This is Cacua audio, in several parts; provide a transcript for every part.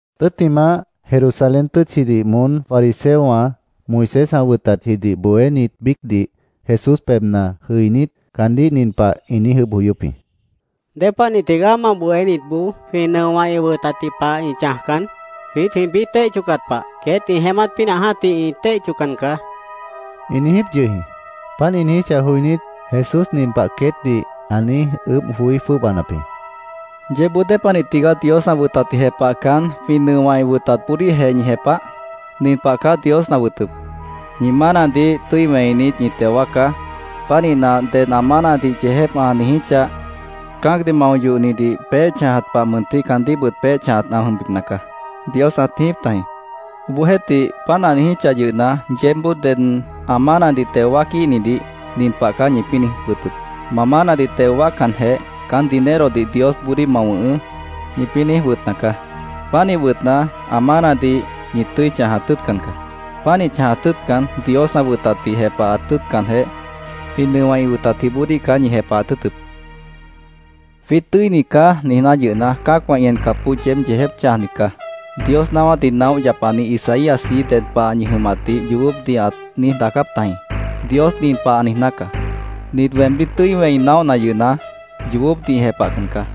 Tʉ́ttimah, Jerusalén tʉ́tchidih moón fariseowã, Moisés ã wʉtatjidih bohénit biícdih, Jesús pebhna jʉinít, caandíh nin pah ĩ niíj ʉʉ́bh joyóp jĩ: —¿Dépanih tigaá ma bohénitboó jwĩ nʉowã ĩ wʉtatji pah ĩ chãjcan? Jwiít jwĩpĩ́ téih chocat pah, queét ĩ jeémát pínah jã́tih ĩ téih choccan caá, ĩ niijíp yʉh jĩ. Páant ĩ niijíchah joinít, Jesús nin pah queétdih ã niíj ʉʉ́bh joí jwʉ́ʉbanap jĩ: —¿Yeébboó dépanih tigaá Dios ã wʉtatdih jepahcan, jwĩ nʉowã ĩ wʉtatboodíhjeh ñi jepah? Nin pah caá Dios ã wʉtʉp: ‘Ñi mánadih tʉ́i wẽinit, ñi teo wáacá.Pánihna, ded ã mánadih yeejép ã niijíchah, cã́acdih mao yohnidih peéh chãjat pah mʉntih caandíhbʉt peéh chãjat ã jʉmbipna caá’, Dios ãt niijíp tajĩ. Obohjeéhtih, páant ã niijíchah yʉhna, yeébboó ded ã mánadih teo wáaquíhnidih nin pah caá ñipĩ́ niíj wʉtʉp: ‘Ma mánadih teo wáaccanjeh, caán dinerodih Diosboodíh ma wʉ̃hʉʉ́’, ñipĩ́ niíj wʉtna caá. Pánih wʉtna, ã mánadih ñi tʉ́i chãjat tʉ́ʉtcan caá. Pánih chãjat tʉ́ʉtcan, Dios ã wʉtatdih jepahat tʉ́ʉtcanjeh, jwĩ nʉowã ĩ wʉtatjiboodíh caá ñi jepahat tʉ́ʉtʉp. ‘Jwiít tʉ́init caá’, niijná yʉhna, cã́acwã ĩ encapboó yeéb yeejép chãjnit caá. Dios naáwátdih naóh yapani Isaíasji ded pah ñi jʉmatdih yoobópdih ãt niíj daacáp tajĩ: ‘Dios nin pah ã niijná caá: “Nit weemdíh tʉ́i wẽi naóhna yʉhna, yoobópdih ĩ jepahcan caá.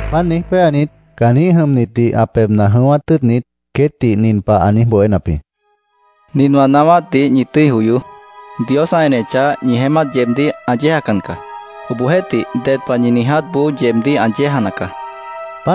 Páant niíj péanit, caanjĩ́h jʉmnitdih ã pebhna jʉ̃ʉ́wát tʉ́ʉtnit, queétdih nin pah ã niíj bohénap jĩ: —Nin wã naáwátdih ñi tʉ́i joyoó. Dios ã enechah, ñi jeémát yeebdíh ã yéejacan caá. Obohjeéhtih, ded pah ñi niijátboó yeebdíh ã yéejana caá, ã niijíp jĩ.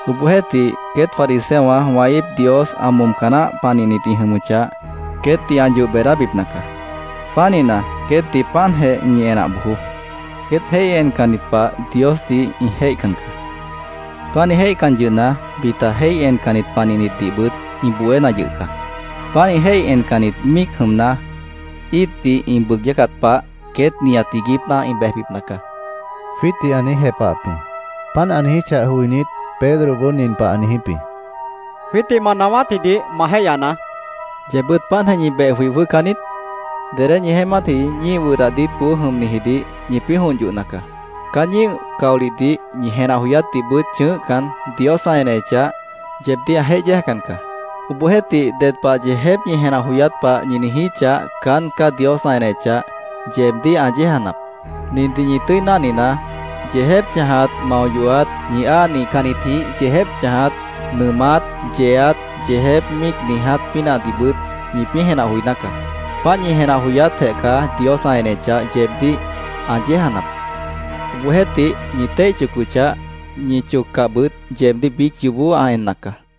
—Obohjeéhtih, queét fariseowã wã íip Dios ã momca naáh panihnit ĩ jʉmʉchah, queétdih ã yoh beedábipna caá. Pánihna, queétdih páantjeh ñi enah bojoó. Queét jéih encannit pah Diosdih ĩ jéihcan caá. Pánih jéihcan yʉhna, bita jéih encannit panihnitdihbʉt ĩ bohéna yʉh caá. Pánih jéih encannit míic jʉmna, íitdih ĩ bʉʉg yácat pah, queét nihat iiguípna ĩ bejbipna caá, jwiítdih ã niíj jepahap jĩ. Páant ã niijíchah joinít, Pedroboó nin pah ã niijíp jĩ: —Jwiítdih ma naáwátjidih ma jéihyanaá, ã niijíp jĩ. —¿Yeebbʉ́t páantjeh ñi beh joi jwʉ́hcan niít? Dedé ñi jeémátji ñíih wʉdah diítboó jʉmnijidih ñipĩ́ jont yohna caá. Caán ñíih caolihdih, ñi jenah joyátdihbʉt chʉ̃ʉ́hcan, Dios ã enechah, yeebdíh ã jéih yéejacan caá. Obohjeéhtih, ded pah yeejép ñi jenah joyát pah ñi niijíchah, caán caá Dios ã enechah, yeebdíh ã yéejanap. Nindih ñi tʉ́i náhninaá: Yeejép chãjat, mao yohat, ñi áa nihcannitjĩh yeejép chãjat, nʉʉmát, yeeat, yeejép míic niiját pínahdihbʉt ñipĩ́ jenah joiná caá. Páant ñi jenah joyátjeh caá, Dios ã enechah, yeebdíh ã yéejanap. Obohjeéhtih, ñi téih chocochah, ñi choccahbʉt yeebdíh biíc yoobó ã enna caá, ã niijíp jĩ.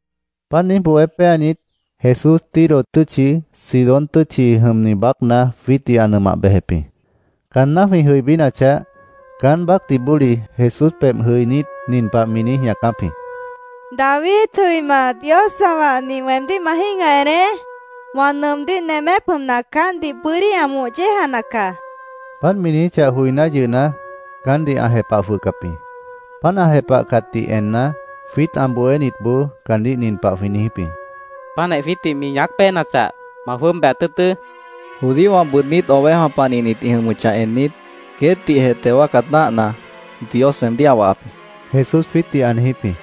Páant niíj bohé péanit, Jesús Tiro tʉ́tchi, Sidón tʉ́tchi jʉmni baácna jwiítdih ã nʉmah bejep jĩ. Caanná jwĩ jʉibínachah, caán baácdih bóli Jesús pebh jʉinít, nin pah mi niíj ñaacáp jĩ: —¡David jʉima, Dios ã wahni, weemdíh ma jĩ́gah eneé! ¡Wã nʉʉmdíh nemép jʉmna, caántdih bʉ́dí ã moh yéejana caá! mi niijíp jĩ. Páant mi niijíchah joiná yʉhna, caántdih ã jepah jwʉhcap jĩ. Páant ã jepahcatdih enna, jwiít ã bohénitboó caandíh nin pah jwĩ niijíp jĩ: —Páantjeh jwiítdih mi ñaác péenachah, ma jwʉ́ʉb bejat tʉ́ʉtʉ́, jwĩ niijíp jĩ. —Judíowã bʉʉdnít ovejawã panihnit ĩ jʉmʉchah ennit, queétdihjeh teo wáacat náahna, Dios weemdíh ã wahap jĩ, Jesús jwiítdih ã niijíp jĩ.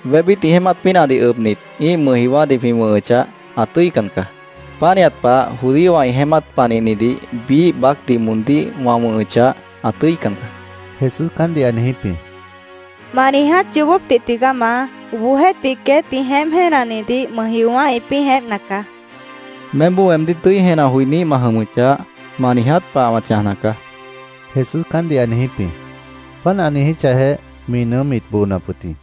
—Wébít ĩ jeémát pínahdih ʉbnit, ĩ́ih mʉjjiowã́dih jwĩ wʉ̃hʉchah, ã tʉ́ican caá. Pánihat pah judíowã ĩ jeémát panihnidih biíh baácdih moondíh wã wʉ̃hʉchah, ã tʉ́ican caá, Jesús caántdih ã niijíp jĩ. —Ma niiját yoobópdih tigaá, Maá. Obohjeéhtih, queét ĩ jeémp jéenanidih mʉjjiowã́ ĩpĩ́ jeémpna caá, mi niíj jepahap jĩ. —Meémboó weemdíh tʉ́i jenah joiníh ma jʉmʉchah, ma niiját pah wã chãjna caá, Jesús caántdih ã niijíp jĩ. Páant ã niijíchahjeh, mi nʉʉ́m mit boonap wʉt jĩ.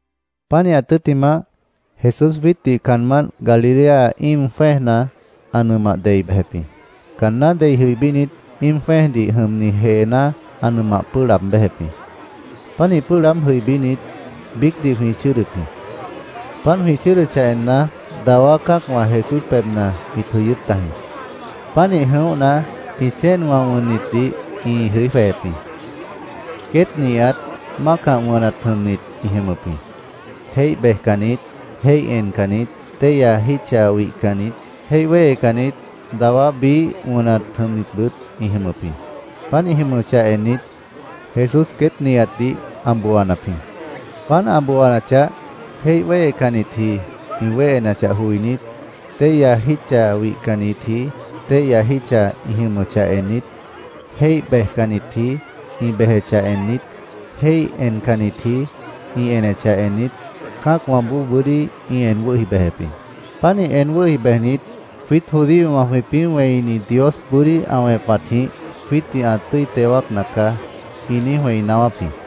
Pánihat tʉ́ttimah, Jesús jwiítdih caanmánt Galilea íim jwẽ́ejna ã nʉmah dei bejep jĩ. Caanná dei jʉibínit, íim jwẽ́ejdih jʉmni jeená ã nʉmah pʉ́ʉh laab béjep jĩ. Pánih pʉ́ʉh laáb jʉibínit, biícdih jwĩ chʉ́ʉdʉp jĩ. Páant jwĩ chʉ́ʉdʉchah enna, dawá cã́acwã Jesús pebhna ĩt jʉ̃ʉ́wʉ́p tajĩ. Pánih jʉ̃óhna, ĩ chéenwã wʉnnitdih ĩ jʉí jwejep jĩ. Queét nihat mácah wʉnat jʉmnit ĩ jʉmʉp jĩ. Jéih bejcannit, jéih encannit, téihya jítcha wihcannit, jéih wéhecannit, dawá biíh wʉnat jʉmnitbʉt ĩ jʉmʉp jĩ. Páant ĩ jʉmʉchah ennit, Jesús queét nihatdih ã booanap jĩ. Páant ã booanachah, jéih wéhecannitji ĩ wéhenachah joinít, téihya jítcha wihcannitji téihya jítcha ĩ jʉmʉchah ennit, jéih bejcannitji ĩ bejechah ennit, jéih encannitji ĩ enechah ennit, cã́acwãboó bʉ́dí ĩ en wʉ́hi bejep jĩ. Pánih en wʉ́hi bejnit, “Jwiít judíowã jwĩpĩ́ wẽini Dios bʉ́dí ã wẽpatjĩh jwiítdih ã tʉ́i teo wáacna caá”, ĩ niíj wẽi naáwáp jĩ.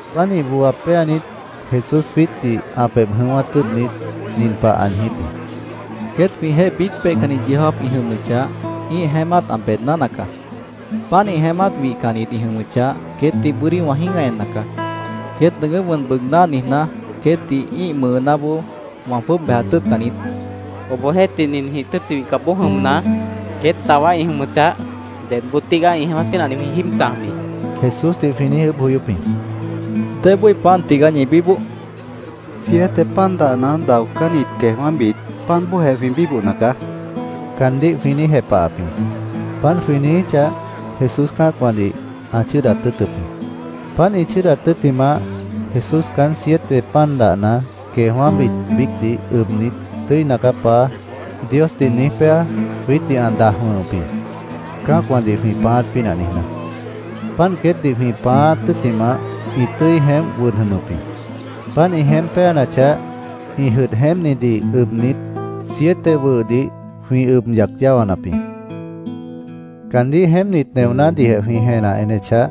Pánih booa péanit, Jesús jwiítdih ã pebh jʉ̃ʉ́wát tʉ́ʉtnit, nin pah ã niijíp jĩ: —Queét jwĩjeéh biíc peihcanni yeó jáap ĩ jʉmʉchah, ĩ́ih jeémát ã beedná nacaá. Pánih jeémát wihcannit ĩ jʉmʉchah, queétdih bʉ́dí wã jĩ́gah enna caá. ‘Queét nʉʉgʉ́p wʉn bʉʉgná’ niijná, queétdih ĩ́ih mʉʉnáboó wã jwʉ́ʉb bejat tʉ́ʉtcan niít, ã niijíp jĩ. —¿Obohjeéhtih, ninjĩh tʉ́tchi wihcapboó jʉmna, queét dawá ĩ jʉmʉchah, dedboo tígaá ĩ jeémát pínahdih jwĩ jíib chãj bií? Jesúsdih jwĩ niíj ʉʉ́bh joyóp jĩ. —¿Débói pan tigaá ñi bíboh? Jesús ã niijíp jĩ. —Siete pan dahna, daocánni queejwã́bit, páant bóojeh jwĩ bíbohna caá, caandíh jwĩ niíj jepahap jĩ. Páant jwĩ niijíchah, Jesús cã́acwãdih ã chʉ́ʉdat tʉ́ʉtʉp jĩ. Páant ĩ chʉ́ʉdat tʉ́ttimah, Jesús caán siete pan dahna, queejwã́bit biícdih ʉbnit, “Tʉ́ina caá, Paá”, Diosdih niíj péa, jwiítdih ã daj wʉ̃hʉp jĩ, cã́acwãdih jwĩ pãáát pínah niijná. Páant queétdih jwĩ pãáát tʉ́ttimah, ĩ tʉ́i jeémp wʉd jʉmʉp jĩ. Páant ĩ jeémp péanachah, ĩ jʉdh jeémpnidih ʉbnit, siete wʉhdih jwĩ ʉb yac yáwanap jĩ. Caandíh jeémpnit neonádihjeh jwĩ jenah enechah,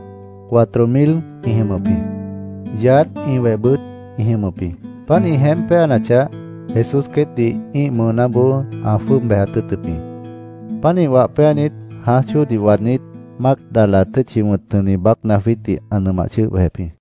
cuatro mil ĩ jʉmʉp jĩ. Yaádh, ĩ wehbʉt ĩ jʉmʉp jĩ. Páant ĩ jeémp péanachah, Jesús queétdih ĩ́ih mʉʉnáboó ã jwʉ́ʉb bejat tʉ́ʉtʉp jĩ. Pánih wah péanit, jãáj chóodih waadnít, Mágdala tʉ́tchi jʉmni baácna jwiítdih ã nʉmah chʉ́ʉh bejep jĩ.